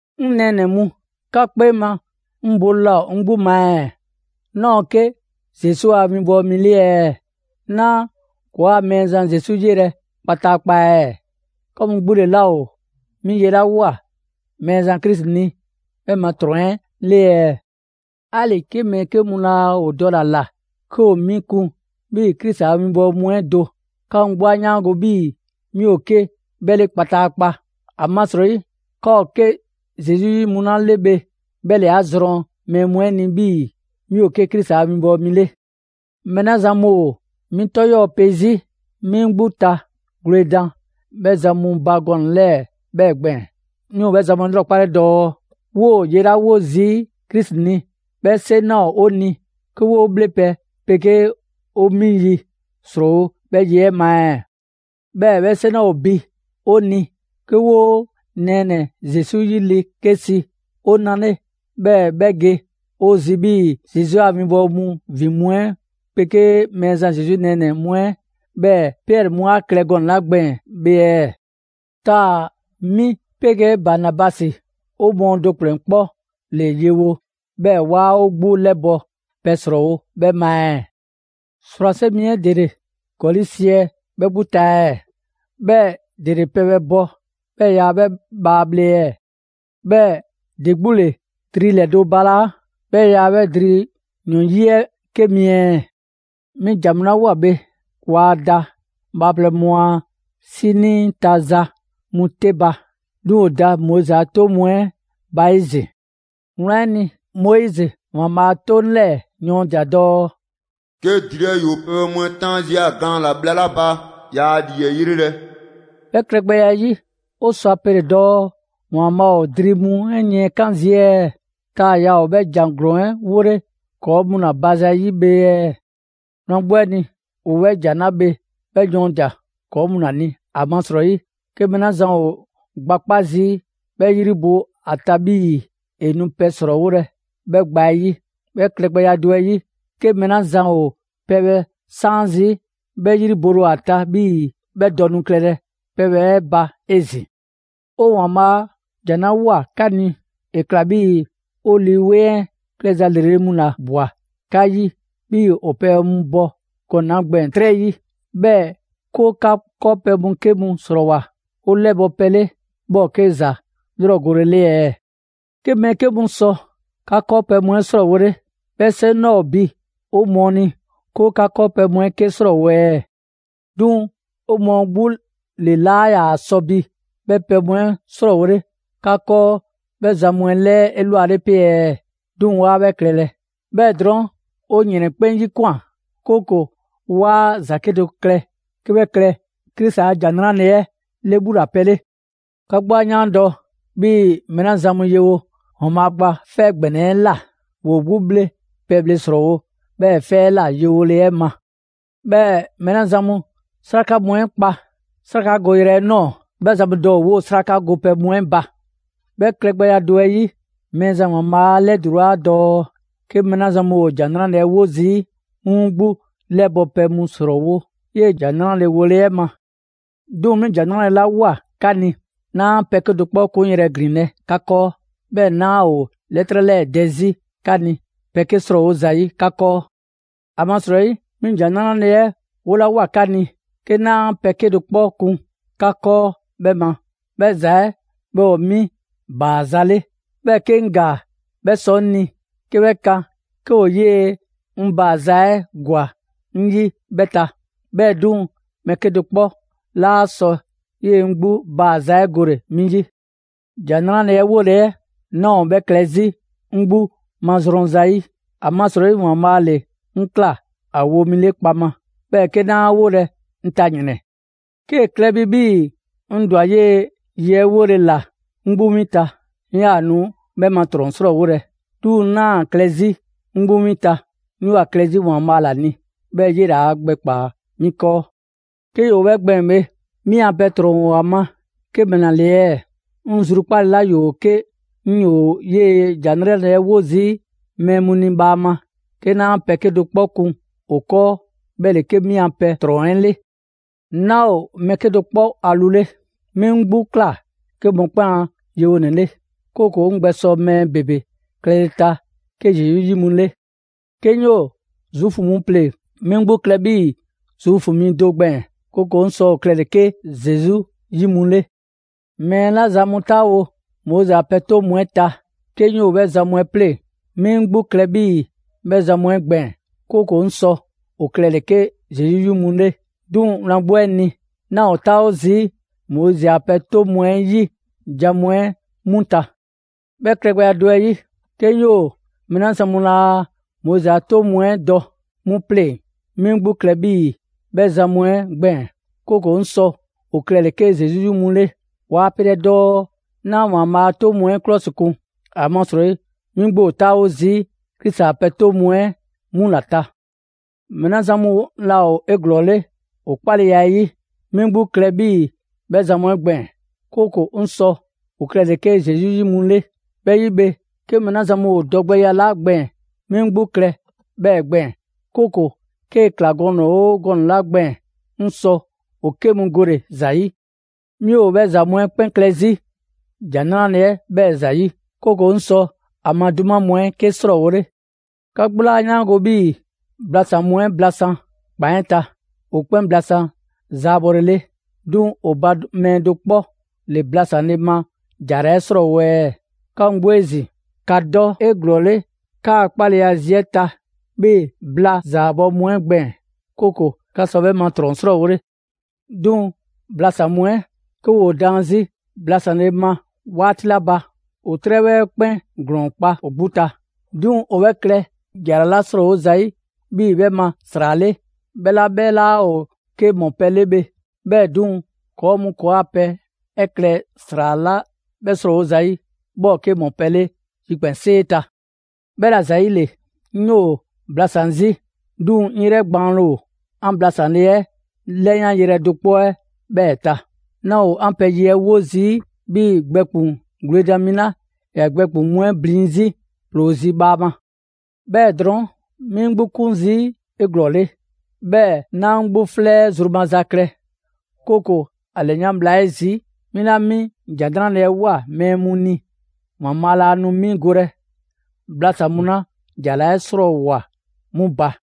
'Ŋ nɛɛnɛ‑ mu, 'ka 'kpee ma 'ŋ bole laa ‑o 'ŋ 'gbu ma ɛɛ? 'Naa‑ ‑o 'ke Zesu a 'winbɔwo mi 'le ɛɛ? 'Naa ‑kɔɔa' Mɛɛzan Zesu 'yelɛ‑ kpataakpa ɛɛ? 'Ka mu 'gbu ‑le 'laa ‑o 'mi ye 'la ꞊woa Mɛɛzan Krisi ni, 'bhɛ ma ‑trɔn 'ɛ 'le ɛɛ? 'Ali‑ 'ke mɛɛ 'ke mu laa ‑o dɔle‑ ‑a ‑la 'ke ‑o 'mi kun 'bhii‑ Krisi a 'winbɔwo mu 'ɛ do, 'ka mu 'gbu 'a 'yaango‑ 'bhii‑ 'mi ‑o 'ke 'bhɛ 'le kpataakpa. ‑Amasrɔyi 'ka ‑o 'ke Zesu 'yi mu 'la 'le bhe 'bhɛ ‑le 'a zrɔn mɛɛ mu ni 'bhii‑ 'mi ‑o 'ke Krisi a winbɔwo mi 'le. Mɛɛ 'la zan mu 'mi 'tɔ 'yɔɔ‑ pe 'zi, 'mi 'ŋ 'gbu ta gwledan 'bhɛ zan mu ba gɔnɛ‑ 'lɛɛ‑ 'bhɛɛ‑ gbɛɛn‑. 'Mi ‑o 'bhɛ zan mu 'ɛ 'lrɔkpale dɔɔ: 'Woo‑ ye 'la 'wo zii' Krisi ni, 'bhɛ 'seŋ 'laa ‑o 'o ni 'ke 'woo bhlepɛ 'pegee 'o mi ‑yi 'srɔɔwo‑ 'bhɛ ye 'ɛ ma ɛɛ? 'Bhɛɛ‑ 'bhɛ 'seŋ 'laa ‑o bi 'o ni 'ke 'woo nɛɛnɛ‑ Zesu 'yi le 'ke si 'o na 'le, 'bhɛɛ‑ 'bhɛ ge 'o zi 'bhii‑ Zesu a 'winbɔwo mu ‑vin mu 'ɛ 'pegee Mɛɛzan Zesu nɛɛnɛ‑ mu 'ɛ, 'bhɛɛ‑ Piɛri mu 'a klɛ gɔnɛ‑ 'la gbɛɛn‑ bhe ɛɛ? Taa‑ 'mi 'pegee Banabasi, 'o mɔɔ do ‑kplɛn 'kpɔ ‑le yewo, 'bhɛɛ‑ 'waa 'o 'gbu 'lɛbɔ‑ pɛ ‑srɔɔwo 'bhɛ ma ɛɛ? ‑Srwase' mi 'ɛ ‑dele ‑gɔli' siɛ 'bhɛ 'gbu ta ɛɛ? 'Bhɛɛ‑ ‑dele pɛbhɛ bɔ 'bhɛɛ‑ yaa 'bhɛ bhaa bhle ɛɛ? 'Bhɛɛ‑ ‑de 'gbu ‑le dri ‑lɛdo' balaa', 'bhɛɛ‑ yaa 'bhɛ dri ‑yɔn 'yi 'ɛ 'ke mi ɛɛ? 'Mi ‑jan mu 'la ꞊woa bhe, waa da bhaaplɛŋ mu a 'sinii ta za mu 'te ba. 'Duŋ‑ ‑o da Moizi a 'toŋ mu 'ɛ ba 'ezin‑. Wlan 'ɛ ni, Moizi ‑Waanbhaa' a 'toŋ 'lɛɛ‑ yɔɔndia‑ dɔɔ: «'Ke dri 'ɛ ‑yoo pɛbhɛ mu 'ɛ 'taan 'zi ‑a gaan ‑la bhla 'la ba, 'yaa 'lii 'ɛ 'yrelɛ‑.» 'Bhɛ klɛgbɛya 'ɛ 'yi, 'o sɔ ‑a pele dɔɔ ‑Waanbhaa' ‑o dri mu yiɛnkan' zii' ɛɛ? Taa‑ yaa 'bhɛ ‑jan ‑glɔɔn 'ɛ 'wolɛ‑ ‑kɔɔ' mu ‑la ba zayi' bhe ɛɛ? Wlan 'gbu 'ɛ ni, ‑o 'bhɛ ‑jan 'la bhe 'bhɛ yɔɔndia‑ ‑kɔɔ' mu ‑la ni, ‑amasrɔyi, 'ke mɛɛ 'la zan ‑o gba 'kpa zii', 'bhɛ 'yri bole ‑o ‑a ta 'bhii‑ ‑e nu pɛ ‑srɔɔwolɛ 'bhɛ gba 'ɛ 'yi. 'Bhɛ klɛgbɛya do 'ɛ 'yi, 'ke mɛɛ 'la zan ‑o pɛbhɛ 'saan zii', 'bhɛ 'yri bole ‑o ‑a ta 'bhii‑ 'bhɛ dɔ nu klɛlɛ pɛbhɛ 'ɛ ba 'ezin‑. 'O ‑Waanbhaa' a ‑jan 'la ꞊woa 'ka ni, ‑e ‑kla 'bhii‑ 'o Lii 'Weŋ 'ɛ klɛza ‑lrele' mu ‑la ꞊bwa 'ka 'yi 'bhii‑ ‑o pɛbhɛ mu bɔ gɔnɛ‑ 'la gbɛɛn‑ 'trɛ 'yi. 'Bhɛɛ‑ 'ke 'o 'ka 'kɔɔpɛ‑ mu 'ke 'srɔɔwoa꞊ 'o 'lɛbɔ‑ pɛ 'le, 'bhɛ ‑o 'ke ‑za 'lrɔgole 'le ɛɛ? 'Ke mɛɛ 'ke mu sɔ 'ka 'kɔɔpɛ‑ mu 'ɛ 'srɔɔwole, 'bhɛ 'seŋ 'laa ‑o bi 'o mɔɔ ni 'ke 'o 'ka 'kɔɔpɛ‑ mu 'ɛ 'ke 'srɔɔwo‑ ɛɛ? 'Duŋ‑ 'o mɔɔ 'gbu ‑le 'laa ‑yaa sɔ bi 'bhɛ pɛ mu 'ɛ 'srɔɔwole 'ka 'kɔɔ 'bhɛ zan mu ‑lɛɛ 'elwale 'pe ɛɛ? 'Duŋ‑ 'waa 'bhɛ klɛlɛ. 'Bhɛɛ‑ drɔɔn' 'o ‑yrɛn 'kpɛn 'yikwan꞊, 'kooko‑ 'waa ‑za 'kedo‑ klɛ 'ke 'bhɛ klɛ Krisi a ‑Jan 'Nrale‑ 'ɛ 'lɛbhulapɛ 'le. 'Ka 'gbu 'a 'yaandɔ‑ 'bhii‑ mɛɛ 'la zan mu yewo ‑Waanbhaa' Gba 'Fɛ ‑Gbɛnɛ 'ɛ ꞊la, ‑woo 'gbu 'bhle pɛbhle ‑srɔɔwo' 'bhɛɛ‑ 'fɛ 'ɛ ꞊la yewole 'ɛ ma. 'Bhɛɛ‑ mɛɛ 'la zan mu 'sraka mu 'ɛ kpa 'srakagoyrɛ 'ɛ ꞊nɔɔ 'bhɛ zan mu dɔ ‑o 'woo‑ 'sraka gopɛ mu 'ɛ ba. 'Bhɛ klɛgbɛya do 'ɛ 'yi, Mɛɛzan ‑Waanbhaa' 'a 'lɛdulaa dɔɔ 'ke mɛɛ 'la zan mu ‑o ‑Jan 'Nrale‑ 'ɛ 'wo zii', 'mu 'mu 'gbu 'lɛbɔ‑ pɛ mu ‑srɔɔwo' 'yee‑ ‑Jan 'Nrale‑ wole 'ɛ ma. 'Duŋ‑ 'mi ‑Jan 'Nrale‑ 'la ꞊woa 'ka ni, 'naa pɛ 'kedo‑ 'kpɔ 'kunyrɛ‑ ‑glinlɛ' 'ka 'kɔɔ. 'Bhɛɛ‑ 'naa ‑o 'lɛtrɛ 'lɛɛ‑ dɛ 'zi 'ka ni, pɛ 'ke 'srɔɔwo zayi' 'ka 'kɔɔ. ‑Amasrɔyi 'mi ‑Jan 'Nrale‑ 'ɛ 'wolawoa 'ka ni 'ke 'naa pɛ 'kedo‑ 'kpɔ kun 'ka 'kɔɔ 'bhɛ ma, 'bhɛ ‑za 'ɛ 'bhɛ ‑o 'mi ‑baaza' 'le. 'Bhɛɛ‑ 'ke 'ŋ ‑gaa 'bhɛ sɔ 'ŋ ni 'ke 'bhɛ kan 'ke ‑o 'yee‑ 'ŋ ‑baaza' 'ɛ ‑gwa 'ŋ 'yi 'bhɛ ta. 'Bhɛɛ‑ 'duŋ‑, mɛɛ 'kedo‑ 'kpɔ 'laa sɔ 'yee‑ 'ŋ 'gbu ‑baaza' 'ɛ gole‑ 'mi 'yi. ‑Jan 'Nrale‑ 'ɛ 'wole‑ 'ɛ, 'naa ‑o 'bhɛ klɛ 'zi 'ŋ 'gbu mazrɔn zayi'. ‑Amasrɔyi ‑Waanbhaa' ‑le 'ŋ ꞊kla ‑a wo mi 'le kpaŋma. 'Bhɛɛ‑ 'ke 'naa 'a 'wolɛ‑, 'ŋ ta ‑yrɛn! 'Kee‑ klɛ bi 'bhii‑ 'ŋ ‑dwa 'yee‑ ye 'ɛ 'wole‑ ‑la 'ŋ 'gbu 'win ta, 'ŋ 'yaa‑ nu 'bhɛ ma ‑trɔn 'srɔɔwolɛ. 'Duŋ‑ 'naa ‑a klɛ 'zi 'ŋ 'gbu 'win ta, 'ŋ 'yoo‑ ‑a klɛ 'zi ‑Waanbhaa' ‑la ni, 'bhɛɛ‑ 'yele 'a gbɛkpaa‑ 'mi 'kɔɔ. 'Ke ‑yoo 'bhɛ gbɛɛn‑ bhe, 'mi a pɛ ‑trɔn ‑o ‑a ma 'ke ‑mɛla ‑le ɛɛ? 'Ŋ zrukpaale 'la ‑yoo 'ke 'ŋ 'yoo‑ 'yee‑ ‑Jan 'Nrale‑ 'ɛ 'wo zii' mɛɛ mu ni bhaama 'ke 'naa pɛ 'kedo‑ 'kpɔ kun ‑o 'kɔɔ, 'bhɛ ‑le 'ke 'mi a pɛ ‑trɔn 'ɛ 'le. 'Naa ‑o mɛɛ 'kedo‑ 'kpɔ a lu 'le. 'Mi 'ŋ 'gbu ꞊kla 'ke mɔkpɛn' a yewonɛ 'le, 'kooko‑ 'ŋ gbɛsɔ mɛɛ ‑bebe klɛle‑ ta 'ke Zesu 'yi mu 'le. 'Ke 'ŋ 'yoo‑ Zuufu mu pleŋ‑, 'mi 'ŋ 'gbu klɛ 'bhii‑ Zuufu mi do gbɛɛn‑, 'kooko‑ 'ŋ sɔ ‑o klɛle 'ke Zesu 'yi mu 'le. Mɛɛ 'la zan mu 'taawo Moizi a pɛ 'toŋ mu 'ɛ ta, 'ke 'ŋ 'yoo‑ 'bhɛ zan mu 'ɛ pleŋ‑, 'mi 'ŋ 'gbu klɛ 'bhii‑ 'bhɛ zan mu 'ɛ gbɛɛn‑; 'kooko‑ 'ŋ sɔ ‑o klɛle‑ 'ke Zesu 'yi mu 'le. 'Duŋ‑ wlan 'gbu 'ɛ ni, 'naa‑ ‑o 'taawo zii' Moizi a pɛ 'toŋ mu 'ɛ 'yi jan mu 'ɛ 'mu ta. 'Bhɛ klɛgbɛya do 'ɛ 'yi, 'ke 'ŋ 'yoo‑ mɛɛ 'la zan mu laa Moizi a pɛ 'toŋ mu 'ɛ dɔ 'mu 'pleŋ‑, 'mi 'ŋ 'gbu klɛ 'bhii‑ 'bhɛ zan mu 'ɛ gbɛɛn‑; 'kooko‑ 'ŋ sɔ ‑o klɛle‑ 'ke Zesu 'yi mu 'le. Waa pelɛ dɔɔ 'naa ‑Waanbhaa' a 'toŋ mu 'ɛ 'klɔsikun; ‑amasrɔyi, 'mi 'gbu ‑o 'taawo zii' Krisi a pɛ 'toŋ mu 'ɛ 'mu ‑la ta. Mɛɛ 'la zan mu laa ‑o 'eglɔɔle ‑o 'kpaleya 'ɛ 'yi, 'mi 'ŋ 'gbu klɛ 'bhii‑ 'bhɛ zan mu 'ɛ gbɛɛn‑; 'kooko‑ 'ŋ sɔ ‑o klɛle 'ke Zesu 'yi mu 'le. 'Bhɛ 'yi bhe, 'ke mɛɛ mu ‑o dɔgbɛya 'la gbɛɛn‑, 'mi 'ŋ 'gbu klɛ 'bhɛɛ‑ gbɛɛn‑, 'kooko‑ 'kee‑ ‑kla gɔnɛ‑ 'oo gɔnɛ‑ 'la gbɛɛn‑, 'ŋ sɔ ‑o 'ke mu gole‑ ‑za 'yi. 'Mi 'bhɛ ‑za mu 'ɛ 'kpɛn klɛ 'zi ‑Jan 'Nrale‑ 'ɛ 'bhɛɛ‑ ‑zayi', 'kooko‑ 'ŋ sɔ ‑a ma 'duma mu 'ɛ 'ke 'srɔɔwole. 'Ka 'gbu 'laa 'yaango‑ 'bhii‑ blasan‑ mu 'ɛ blasan‑ ‑kpan 'ɛ ta, ‑o 'kpɛn blasan zaabɔlele. 'Duŋ‑ ‑o ba mɛɛ do 'kpɔ ‑le ‑blasanle ma ‑jara 'ɛ 'srɔɔwo‑ ɛɛ? 'Ka mu 'gbu 'ezin‑, ‑ka dɔ 'eglɔɔle 'kaa‑ 'kpaleya zi 'ɛ ta 'bhii‑ bla zaabɔ mu 'ɛ gbɛɛn‑; 'kooko‑ 'ka 'sɔ 'bhɛ ma ‑trɔn 'srɔɔwole. 'Duŋ‑ blasan‑ mu 'ɛ, 'ke ‑woo daan 'zi blasanle ma 'waati 'la ba, ‑o 'trɛbhɔ 'ɛ 'kpɛn ‑glɔɔn kpa ‑o 'gbu ta. 'Duŋ‑ ‑o 'bhɛ klɛ ‑jara 'la 'srɔɔwo zayi' 'bhii‑ 'bhɛ ma ‑sra 'le, 'bhɛ 'la 'bhɛ 'laa ‑o 'ke ‑mɔpɛ' 'le bhe. 'Bhɛɛ‑ 'duŋ‑, ‑kɔɔ' mu ‑kɔɔa' pɛ 'ɛ klɛ ‑sra 'la 'bhɛ 'srɔɔwo zayi', 'bhɛ ‑o 'ke ‑mɔpɛ' 'le yikpɛnsee ta. 'Bhɛla‑ ‑zayile, 'ŋ 'yoo‑ blasan‑ 'zi; 'duŋ‑ 'ŋ 'yrɛ gbaanle ‑o 'an blasanle 'ɛ 'lɛyanyrɛ do 'kpɔ 'ɛ 'bhɛɛ‑ ta. 'Naa ‑o 'an pɛ ye 'ɛ 'wo zii' 'bhii‑ gbɛkpuŋ‑ gwledan mi 'la ‑ya gbɛkpuŋ‑ mu 'ɛ blin 'zi ‑ploo zi bhaama. 'Bhɛɛ‑ drɔɔn', 'mi 'ŋ 'gbu 'kun zii' 'eglɔɔle, 'bhɛɛ‑ 'naa 'ŋ 'gbu 'flɛ 'ɛ zru maza klɛ; 'kooko‑ ‑a ‑lɛyan' bhla 'ɛ zi, 'mi 'la 'mi ‑Jan 'Nrale‑ 'ɛ ꞊woa mɛɛ mu ni, ‑Waanbhaa' laa nu 'mi golɛ blasan‑ mu 'la ‑jara 'ɛ 'srɔɔwoa‑ 'mu ba.